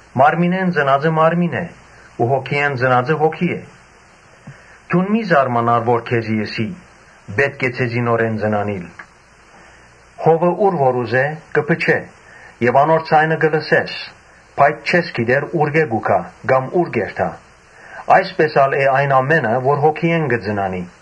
Մարմինէն ծնածը մարմին է ու Հոգիէն ծնածը հոգի է։ Դուն մի՛ զարմանար որ քեզի ըսի. ‘Պէտք է ձեզի նորէն ծնանիլ’։ Հովը ուր որ ուզէ՝ կը փչէ։ Անոր ձայնը կը լսես, բայց չես գիտեր ուրկէ՞ կու գայ, կամ ո՞ւր կ’երթայ։ Այսպէս ալ է այն ամէնը, որ Հոգիէն կը ծնանի»։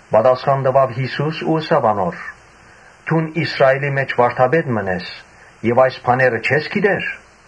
Պատասխան տուաւ Յիսուս ու ըսաւ անոր. «Դուն Իսրայէլի մէջ վարդապետ մըն ես եւ այս բաները չե՞ս գիտեր։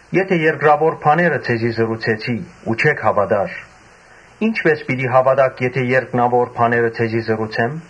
Եթէ երկրաւոր բաները ձեզի ըսի ու չէք հաւատար, ի՞նչպէս պիտի հաւատաք եթէ երկնաւոր բաները ձեզի պատմեմ։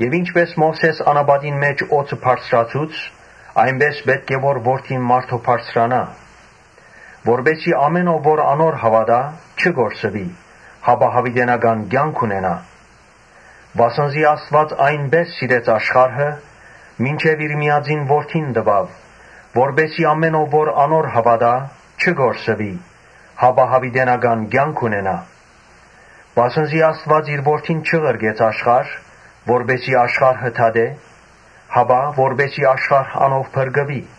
Ինչպէս Մովսէս անապատին մէջ օձը բարձրացուց, այնպէս ալ պէտք է որ Որդին մարդոյ բարձրանայ, Որպէս զի ամէն ո՛վ որ անոր հաւատայ՝ չկորսուի, հապա յաւիտենական կեանք ունենայ։ Վասն զի Աստուած այնպէս սիրեց աշխարհը, մինչեւ իր միածին Որդին տուաւ, որպէս զի ամէն ո՛վ որ անոր հաւատայ՝ չկորսուի, հապա յաւիտենական կեանք ունենայ։ Վասն զի Աստուած իր Որդին չղրկեց աշխարհ, որպէս զի աշխարհը դատէ, հապա՝ որպէս զի աշխարհ անով փրկուի։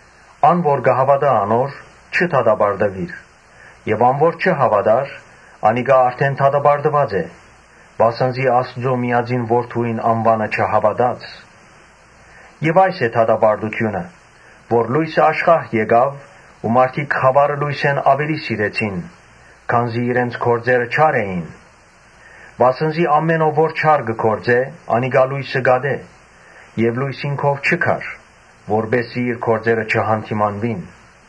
Ան՝ որ կը հաւատայ անոր՝ չի դատապարտուիր եւ ան որ չի հաւատար՝ անիկա արդէն դատապարտուած է, վասն զի Աստուծոյ միածին Որդիին անուանը չհաւատաց։ Այս է դատապարտութիւնը, որ լոյսը աշխարհ եկաւ ու մարդիկ խաւարը լոյսէն աւելի սիրեցին, քանզի իրենց գործերը չար էին։ Վասն զի ամէն ո՛վ որ չարը կը գործէ, անիկա լոյսը կ’ատէ եւ լոյսին քով չի գար, որպէս զի իր գործերը չյանդիմանուին։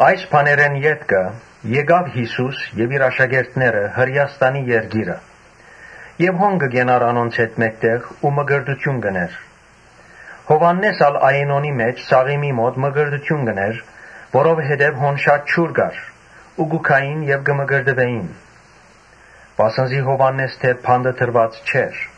Այս բաներէն ետքը Յիսուս եւ իր աշակերտները Հրէաստանի երկիրը եկան։ Ինք կը կենար անոնց հետ մէկտեղ ու մկրտութիւն կ’ընէր։ Յովհաննէս ալ Այենոնի մէջ Սաղիմի մօտ մկրտութիւն կ’ընէր, որովհետեւ հոն շատ ջուր կար ու կու գային եւ կը մկրտուէին. Վասն զի Յովհաննէս դեռ բանտը դրուած չէր։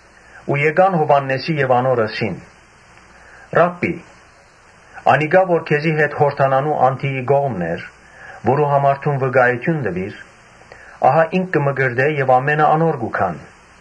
Աշակերտները գացին Յովհաննէսին եւ անոր ըսին. «Ռա՛բբի, անիկա որ քեզի հետ Յորդանանի անդիի կողմն էր, որուն համար դուն վկայութիւն տուիր, ահա ինք կը մկրտէ եւ ամէնքը անոր կ’երթան»։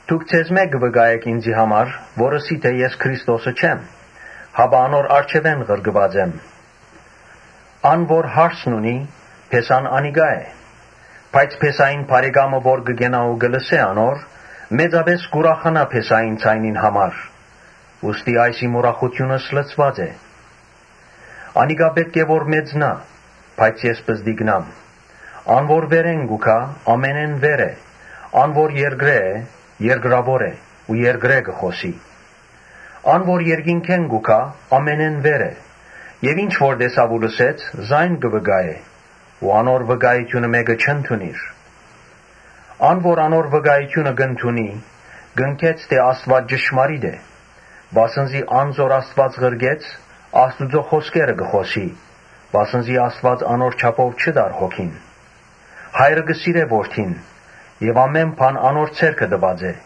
Դուք ձեզմէ կը վկայէք ինծի համար, որ ըսի թէ ‘Ես Քրիստոսը չեմ, հապա անոր առջեւէն ղրկուած եմ’։ Ան որ հարսն ունի, փեսան անիկա է. բայց փեսային բարեկամը, որ կը կենայ ու կը լսէ անոր, մեծապէս կ’ուրախանայ փեսային ձայնին համար։ Ուստի ահա իմ ուրախութիւնս լեցուած է։ Անիկա պէտք է որ մեծնայ, բայց ես պզտկնամ»։ Ան որ վերէն կու գայ՝ ամենէն վեր է. ան որ երկրէն է՝ երկրաւոր է ու երկրէն կը խօսի. ան որ երկնքէն կու գայ՝ ամենէն վեր է։ Եւ ինչ որ տեսաւ ու լսեց, զայն կը վկայէ ու անոր վկայութիւնը մէ՛կը չընդունիր։ Ան որ անոր վկայութիւնը կ’ընդունի, կ’ապացուցանէ թէ Աստուած ճշմարիտ է։ Վասն զի ան որ Աստուած ղրկեց, Աստուծոյ խօսքերը կը խօսի, վասն զի Աստուած անոր չափով չի տար Հոգին։ Հայրը կը սիրէ Որդին եւ ամէն բան անոր ձեռքը տրուած է։